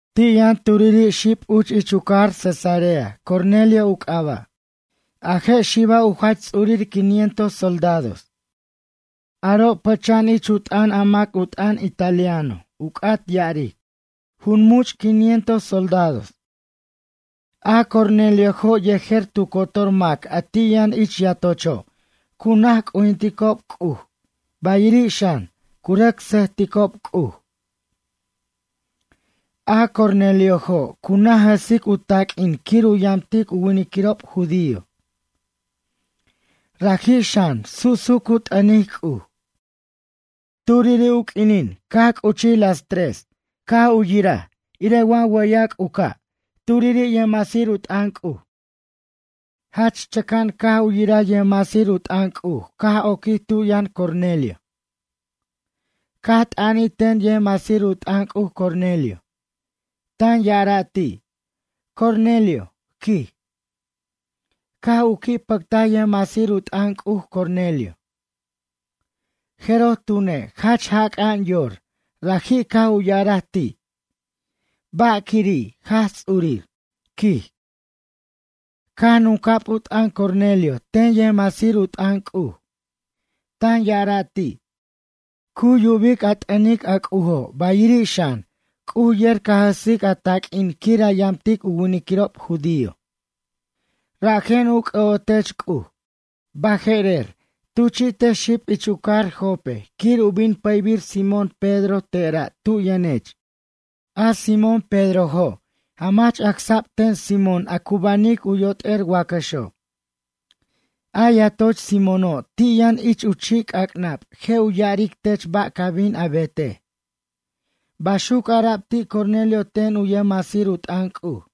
Ti' yʌn turiri' xib uch ich u cajar Cesarea, Cornelio u c'aba'. A je' xiba' u jach ts'urir quinientos soldados. Aro' pʌcha'an ich u t'ʌn a mac u t'ʌn Italiano u c'at ya'aric: Jun much' quinientos soldados. A Corneliojo', yejer tu cotor mac a ti' yʌn ich yatocho', cu naj c'ujinticob C'uj, bayiri' xan, cu rʌc sʌjticob C'uj. A Corneliojo', cu naj jʌsic u taq'uin quir u yamtic u winiquirob judío. Raji' xan, su'su' cu t'ʌnic C'uj. Turiri' u q'uinin caj c'uchij tu q'uinin las mʌna' u nup caj u yiraj irej wa wʌyac' u ca' turiri' yʌjmasir u t'ʌn C'uj. Jach chʌca'an caj u yiraj. Yʌjmasir u t'ʌn C'uj caj oquij tu yʌn Cornelio. Caj t'ʌnij ten yʌjmasir u t'ʌn C'uj Cornelio. Tan ya'ara' ti': ―Cornelio ―quij. Caj u qui' pʌctaj yʌjmasir u t'ʌn C'uj, Cornelio. Jeroj tune', jach jac'a'an yor, raji' caj u ya'araj ti': ―Ba' quiri', Jaj Ts'urir? ―quij. Caj nunca'b u t'ʌn Cornelio ten yʌjmasir u t'ʌn C'uj. Tan ya'ara' ti': ―Cu yubic a t'ʌnic, a C'ujo', bayiri' xan, C'uj yer ca jʌsic a taq'uin quir a yamtic u winiquirob judío. Rajen u c'ʌ'otech C'uj. Baje'rer, tuchi'tej xib ich u cajar Jope quir u bin pʌybir Simón Pedro tera' tu yʌnech. A Simón Pedrojo', jamach acsa'b ten Simón a cu banic u yot'er wacʌxo'. A yatoch Simóno', ti' yʌn ich chi' c'ac'nab je' u ya'aric tech ba' ca bin a betej ―baxuc ara'b ti' Cornelio ten u yʌjmasir u t'ʌn C'uj.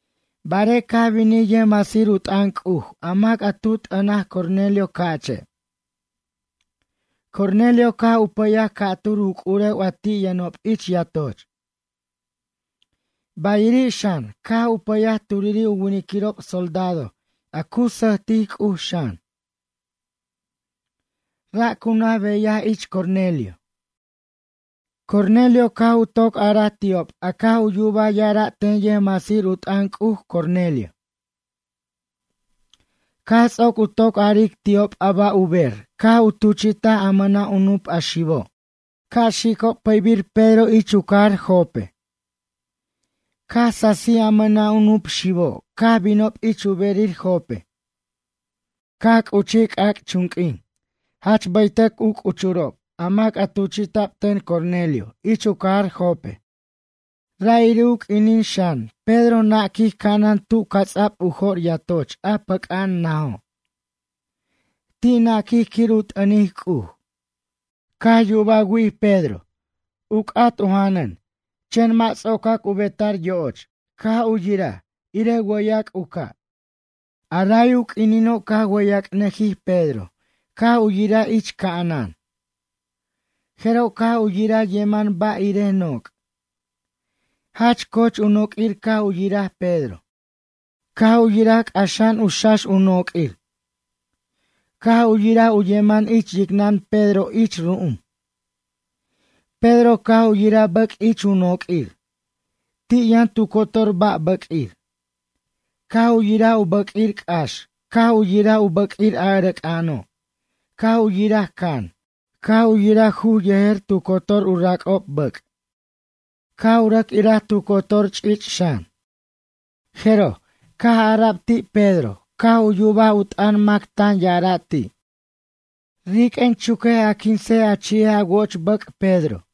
Barej caj binij yʌjmasir u t'ʌn C'uj, a mac a tu t'ʌnaj Cornelio ca'che'. Cornelio caj u pʌyaj ca'tur u c'urew a ti' yʌnob ich yatoch. Bayiri' xan, caj u pʌyaj turiri' u winiquirob soldado, a cu sʌjtic C'uj xan. Ra' cu naj beyaj ich Cornelio. Cornelio caj u toc araj ti'ob a caj u yubaj ya'ara' ten yʌjmasir u t'ʌn C'uj, Cornelio. Caj ts'oc u toc aric ti'ob a ba' u ber, caj u tuchi'taj a mʌna' u nup a xibo' ca' xicob pʌbir Pedro ich u cajar Jope. Caj sasij a mʌna' u nup xibo', caj binob ich u berir Jope. Caj c'uchij c'ac'chunq'uin jach bʌytʌc u c'uchurob a mac a tuchi'ta'b ten Cornelio ich u cajar Jope. Ra'iri' u q'uinin xan, Pedro naquij ca'anan tu ca'ts'ab u jo'r yatoch a pac'a'an najo'. Ti' naquij quir u t'ʌnic C'uj. Caj yubaj wi'ij Pedro u c'at u janʌn Pedro uch. Mʌ' ts'ocac u beta'r yo'och, caj u yiraj irej wʌyac' u ca'. A ray u q'uinino' caj wʌyac'nʌjij Pedro, caj u yiraj ich ca'anan. Jeroj caj u yiraj yeman ba' irej noc'. Jach coch u noq'uir caj u yiraj Pedro. Caj u yiraj c'axa'an u xax u noq'uir. Caj u yiraj u yemen ich yicnʌn Pedro ich ru'um. Pedro caj u yiraj bʌc' ich u noq'uir. Ti' yʌn tu cotor ba' bʌq'uir. Caj u yiraj u bʌq'uir c'ax, caj u yiraj u bʌq'uir a ʌrʌc'a'ano'. Caj u yiraj can, caj u yiraj juj yejer tu cotor u rac'ob bʌc', caj u rʌc iraj tu cotor ch'ich' xan. Jeroj, caj ara'b ti' Pedro, caj u yubaj u t'ʌn mac tan ya'ara' ti': ―Riq'uen, chuquej a quinsej a chi'ej a wo'och bʌc', Pedro.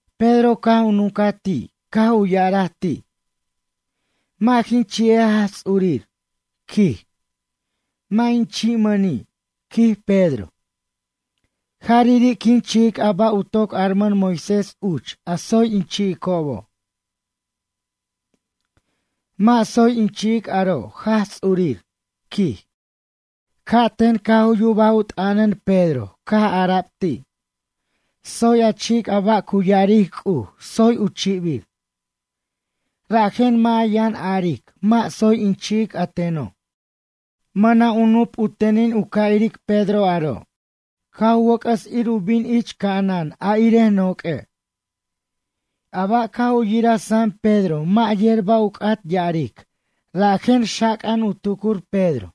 Pedro caj u nuncaj ti', caj u ya'araj ti': ―Mʌ' jin chi'ej Jaj Ts'urir ―quij―. Mʌ' in chi'mʌni' ―quij Pedro―. Jarari' quin chi'ic a ba' u toc armʌn Moisés uch, a tsoy in chi'icobo'. Mʌ' tsoy in chi'ic aro', Jaj Ts'urir ―quij. Ca'ten caj u yubaj u t'ʌnʌn Pedro, caj ara'b ti': ―Tsoy a chi'ic a ba' cu ya'aric C'uj, tsoy u chibir. Rajen mʌ' a yʌn aric, mʌ' tsoy in chi'ic a teno'. Mʌna' u nup, u tenin u ca' iric Pedro aro', caj u wʌc'ʌs ir u bin ich ca'anan, a irej noq'ue'. A ba' caj u yiraj sam Pedro mʌ' yer ba' u c'at ya'aric, rajen xac'a'an u tucur Pedro,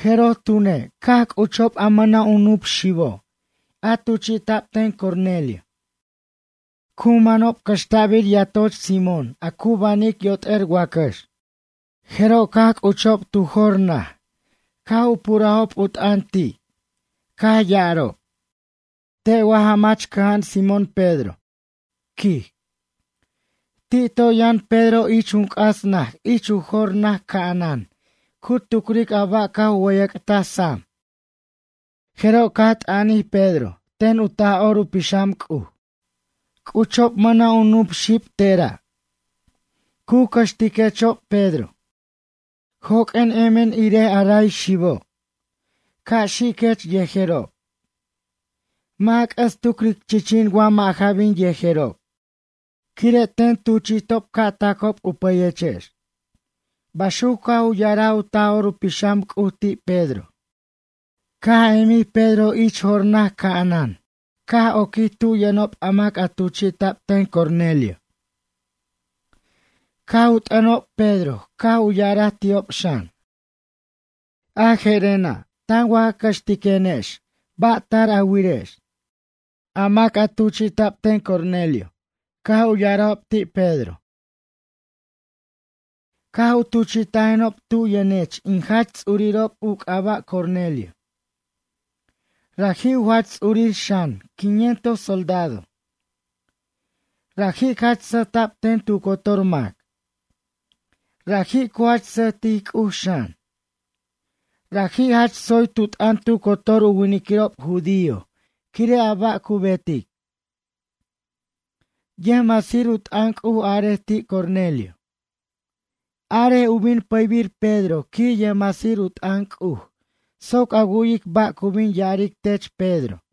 jeroj tune', caj c'uchob a mʌna' u nup xibo', a tuchi'ta'b ten Cornelio. Cu manob cʌxta'bir yatoch Simón, a cu banic yot'er wacʌx. Jeroj caj c'uchob tu jor naj, caj u purajob u t'ʌn ti', caj ya'arob: ―Te' wa jamach cʌja'an Simón Pedro? ―quij. Ti' toy yʌn Pedro ich jun c'as naj ich u jor naj ca'anan cu tucric a ba' caj u wʌyac'taj sam, jeroj caj t'ʌnbij ten u Taj'or u Pixam C'uj Pedro: ―C'uchob mʌna' u nup xib tera'. Cu cʌxtiquechob, Pedro. Joq'uen emen irej a ray xibo'. Ca' xiquech yejerob. Mʌ' a c'ʌs tucric chichin wa mʌ' ja bin yejerob. Quire' ten tuchi'tob ca' tacob u pʌyechex ―baxuc caj u ya'araj u Taj'or u Pixam C'uj ti' Pedro. Caj emij Pedro ich jor naj ca'anan, caj oquij tu yʌnob a mac a tuchi'ta'b ten Cornelio. Caj u t'ʌnob Pedro, caj u ya'araj ti'ob xan: ―Je'rena', tan wa ja cʌxtiquenex, ba' tar a wirex? A mac a tuchi'ta'b ten Cornelio caj u ya'arajob ti' Pedro: ―Caj u tuchi'tajenob tu yʌnech, in Jach Ts'urirob, u c'aba' Cornelio. Raji' u jach ts'urir xan, quinientos soldado. Raji' jach sʌjta'b ten tu cotor mac. Raji' cu jach sʌjtic C'uj xan. Raji' jach tsoy tu t'ʌn tu cotor u winiquirob judío quire' a ba' cu betic. Yʌjmasir u t'ʌn C'uj arej ti' Cornelio: “Arej u bin pʌybir Pedro quij yʌjmasir u t'ʌn C'uj, soc a wu'yic ba' cu bin ya'aric tech Pedro.”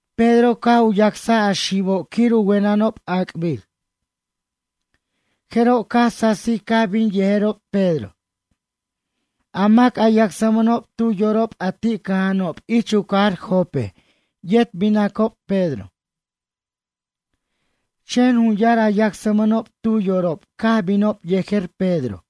Pedro caj u yacsaj a xibo' quir u wenʌnob ac'bir. Jeroj caj sasij caj bin yejerob Pedro. A mac a yacsmʌnob tu yorob a ti' cʌja'anob ich u cajar Jope yet binacob Pedro. Chen jun yar a yacsmʌnob tu yorob caj binob yejer Pedro.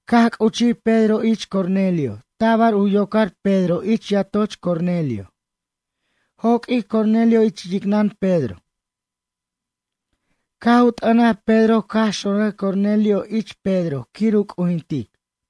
Caj c'uchij Pedro ich Cornelio, tabar u yocar Pedro ich yatoch Cornelio joq'uij Cornelio ich yicnʌn Pedro. Caj u t'ʌnaj Pedro caj xonraj Cornelio ich Pedro quir u c'ujintic.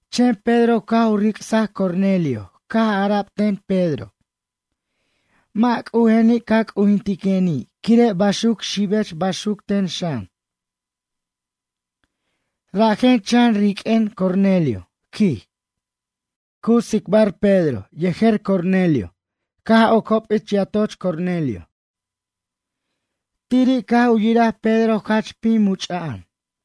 Chen Pedro caj u ric'saj Cornelio, caj ara'b ten Pedro: ―Mʌ' c'ujeni' ca' a c'ujinteni', quire' baxuc xibech, baxuc ten xan. Rajen chan riq'uen, Cornelio ―quij. Cu tsicbar Pedro yejer Cornelio caj ocob ich yatoch Cornelio. Tiri' caj u yiraj Pedro jach pim much'a'an.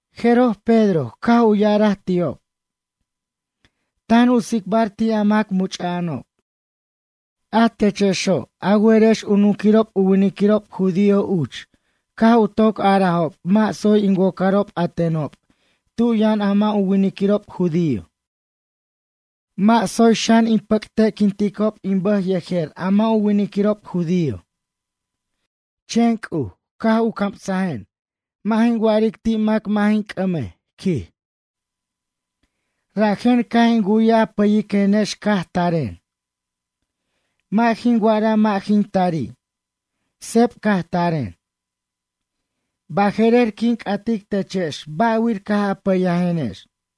Jeroj, Pedro caj u ya'araj ti'ob. Tan u tsicbar ti' a mac much'a'anob: ―A techexo', a werex u nunquirob u winiquirob judío uch, caj u toc arajob mʌ' tsoy in wocarob a tenob tu yʌn a mʌ' u winiquirob judío. Mʌ' tsoy xan in pʌcte'quinticob in bʌj yejer a mʌ' u winiquirob judío. Chen C'uj caj u camsajen mʌ' jin wa'aric ti' mac mʌ' jin c'ʌmej ―quij. Rajen caj in wu'yaj a pʌyiquenex caj taren. Mʌ' jin wa'araj mʌ' jin tari'. Seb caj taren. Baje'rer, quin c'atic techex ba'wir caj a pʌyajenex?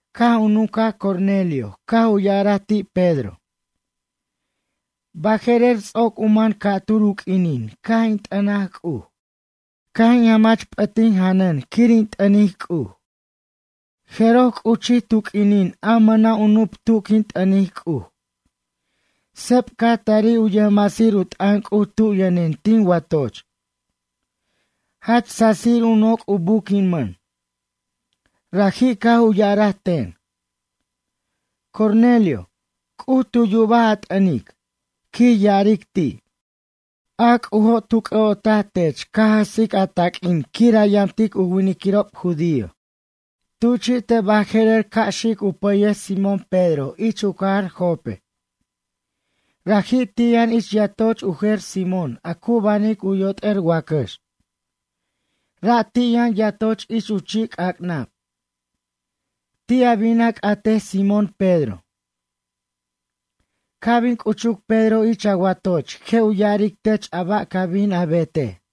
Caj u nuncaj Cornelio, caj u ya'ara ti' Pedro: ―Baje'rer, ts'oc u man ca'tur u q'uinin caj in t'ʌnaj C'uj. Caj in jamach p'ʌt tin janʌn quir in t'ʌnic C'uj. Jeroj, c'uchij tu q'uinin a mʌna' u nup tu quin t'ʌnic C'uj. Seb caj tarij u yʌjmasir u t'ʌn C'uj tu yʌnen tin watoch. Jach sasir u noc' u buquimʌn. Raji' caj u ya'araj ten: “Cornelio, C'uj tu yubaj a t'ʌnic, quij ya'aric ti'. A C'ujo', tu c'ʌ'otaj tech ca jʌsic a taq'uin quir a yamtic u winiquirob judío. Tuchi'tej baje'rer ca' xic u pʌyej Simón Pedro ich u cajar Jope. Raji' ti' yʌn ich yatoch u jer Simón a cu banic u yot'er wacʌx. Ra' ti' yʌn yatoch ich u chi'c'ac'nab. Ti' a bin a c'atej Simón Pedro. Ca' bin c'uchuc Pedro ich a watoch je' u ya'aric tech a ba' ca bin a betej.”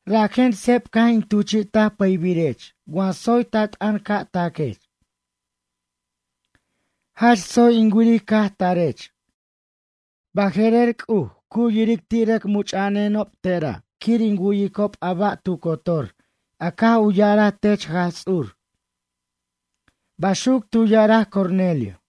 Rajen, seb caj in tuchi'taj pʌybirech, wa tsoy ta t'ʌn ca' taquech. Jach tsoy in wiric caj tarech. Baje'rer, C'uj cu yiric ti' rʌc much'a'anenob tera' quir in wu'yicob a ba' tu cotor a caj u ya'araj tech Jaj Ts'ur ―baxuc tu ya'araj Cornelio.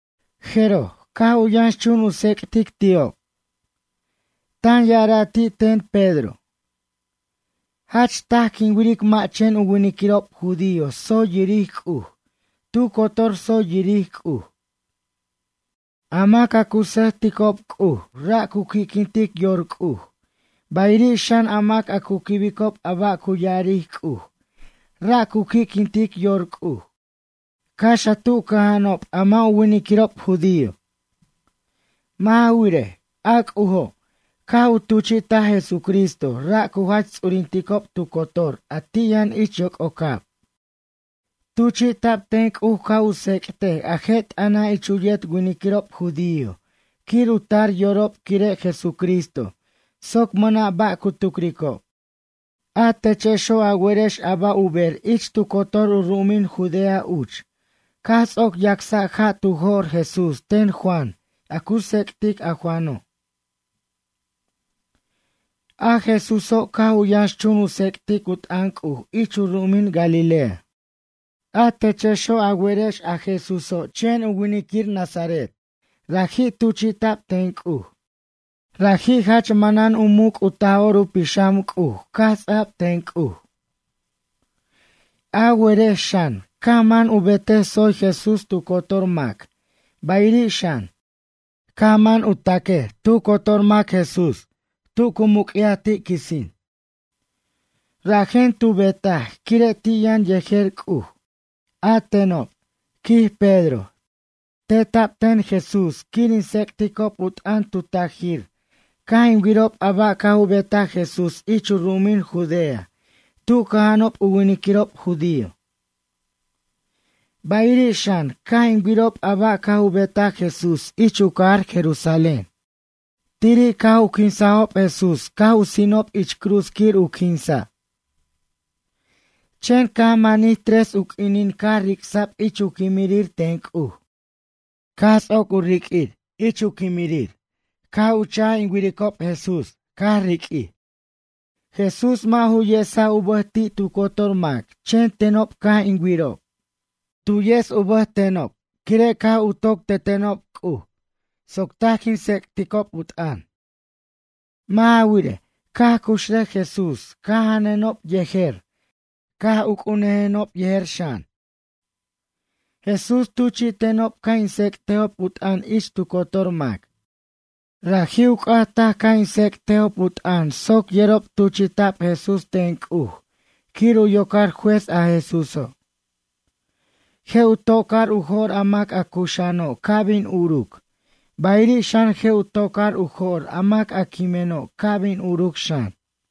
Jeroj, caj u yʌnxchun u tsec'tic ti'ob. Tan ya'ara' ti' ten Pedro: ―Jach taj, quin wiric mʌ' chen u winiquirob judío tsoy yiric C'uj, tu cotor tsoy yiric C'uj. A mac a cu sʌjticob C'uj ra' cu qui'quintic yor C'uj, bayiri' xan, a mac a cu quibicob a ba' cu ya'aric C'uj ra' cu qui'quintic yor C'uj, cax a tu cʌja'anob a mʌ' u winiquirob judío. Mʌ' ja wirej, a C'ujo' caj u tuchi'taj Jesucristo, ra' cu jach ts'urinticob tu cotor a ti' yʌn ich yoc'ocab. Tuchi'ta'b ten C'uj ca' u tsec'tej a je' t'ʌna' ich u yet winiquirob judío quir u tar yorob quire' Jesucristo soc mʌna' ba' cu tucricob. A techexo', a werex a ba' u ber ich tu cotor u ru'umin Judea uch caj ts'oc yacsa' ja' tu jo'r Jesús ten Juan a cu tsec'tic a Juano'. A Jesúso', caj u yʌnxchun u tsec'tic u t'ʌn C'uj ich u ru'umin Galilea. A techexo', a werex a Jesúso', chen winiquir nazaret, raji' tuchi'ta'b ten C'uj. Raji' jach manan u muc' u Taj'or u Pixam C'uj caj ts'a'b ten C'uj. A werex xan, caj man u betej tsoy Jesús tu cotor mac, bayiri' xan, caj man u tacaj tu cotor mac Jesús tu cu muc'yaj ti' quisin. Rajen tu betaj, quire' ti' yʌn yejer C'uj. A tenob ―quij Pedro―, teta'b ten Jesús quir in tsec'ticob u t'ʌn tu tajir caj in wirob a ba' caj u betaj Jesús ich u ru'umin Judea tu cʌja'anob u winiquirob judío. Bayiri' xan, caj in wirob a ba' caj u betaj Jesús ich u cajar Jerusalén. Tiri' caj u quinsajob Jesús caj u sinob ich cruz quir u quinsa'. Chen caj manij tres u q'uinin caj ric'sa'b ich u quimirir ten C'uj. Caj ts'oc u riq'uir ich u quimirir caj u cha'j in wiricob Jesús caj riq'uir. Jesús mʌ' ju yesaj u bʌj ti' tu cotor mac chen tenob caj in wirob. Tu yes u bʌj tenob quire' caj u toc tetenob C'uj soc taj quin tsec'ticob u t'ʌn. Mʌ' ja wirej, caj cuxrʌj Jesús caj janʌnenob yejer caj uc'urnʌjenob yejer xan. Jesús tuchi'tenob ca' in tsec'tejob u t'ʌn ich tu cotor mac. Raji' u c'at taj ca' in tsec'tejob u t'ʌn soc yerob tuchi'ta'b Jesús ten C'uj quir u yocar Juez a Jesúso'. Je' u tocar u jo'r a mac a cuxa'ano' ca' bin uruc, bayiri' xan je' u tocar u jo'r a mac a quimeno' ca' bin uruc xan.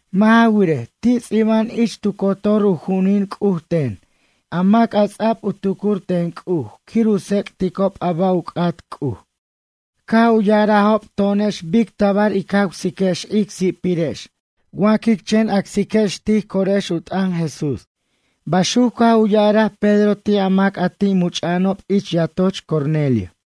Mʌ' ja wirej, ti' ts'iba'an ich tu cotor u ju'unin C'uj ten a mac a ts'ab u tucur ten C'uj quir u tsec'ticob a ba' u c'at C'uj. Caj u ya'arajob to'onex bic tabar ic jawsiquex ic si'pirex wa quic chen acsiquex tij corex u t'ʌn Jesús ―baxuc caj u ya'araj Pedro ti' a mac a ti' much'a'anob ich yatoch Cornelio.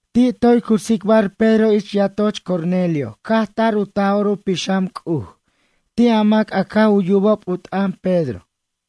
Ti' toy cu tsicbar Pedro ich yatoch Cornelio, caj tar u Taj'or u Pixam C'uj ti' a mac a caj u yubob u t'ʌn Pedro.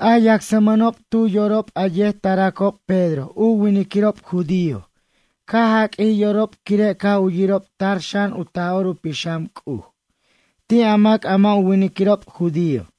A yacsmʌnob tu yorob a yet taracob Pedro u winiquirob judío caj jaq'uij yorob quire' caj u yirob tar xan u Taj'or u Pixam C'uj ti' a mac a mʌ' u winiquirob judío.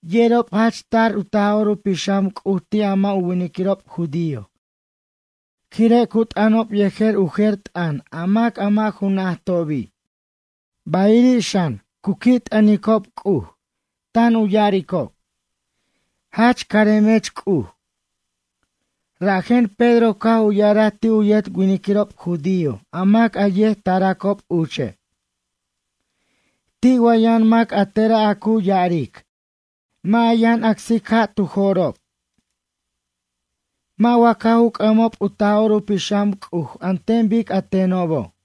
Yerob jach tar u Taj'or u Pixam C'uj ti' a mʌ' u winiquirob judío, quire' cu t'ʌnob yejer u jer t'ʌn a mac a mʌ' ju najtobi', bayiri' xan, cu qui' t'ʌnicob C'uj tan u ya'aricob: ―Jach caremech C'uj. Rajen Pedro caj u ya'araj ti' u yet winiquirob judío a mac a yet taracob uche': ―Ti' wa yʌn mac a tera' a cu ya'aric, mʌ' a yʌn acsic ja' tu jo'rob? Mʌ' wa caj u c'ʌmob u Taj'or u Pixam C'uj an ten bic a tenobo'?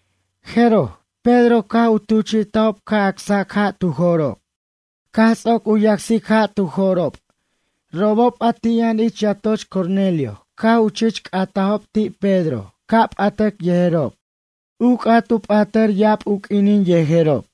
Jeroj, Pedro caj u tuchi'tajob ca' acsac ja' tu jo'rob. Caj ts'oc u yacsic ja' tu jo'rob robob a ti' yʌn ich yatoch Cornelio caj u chich c'atajob ti' Pedro ca' p'atʌc yejerob. U c'at u p'atʌr ya'ab u q'uinin yejerob.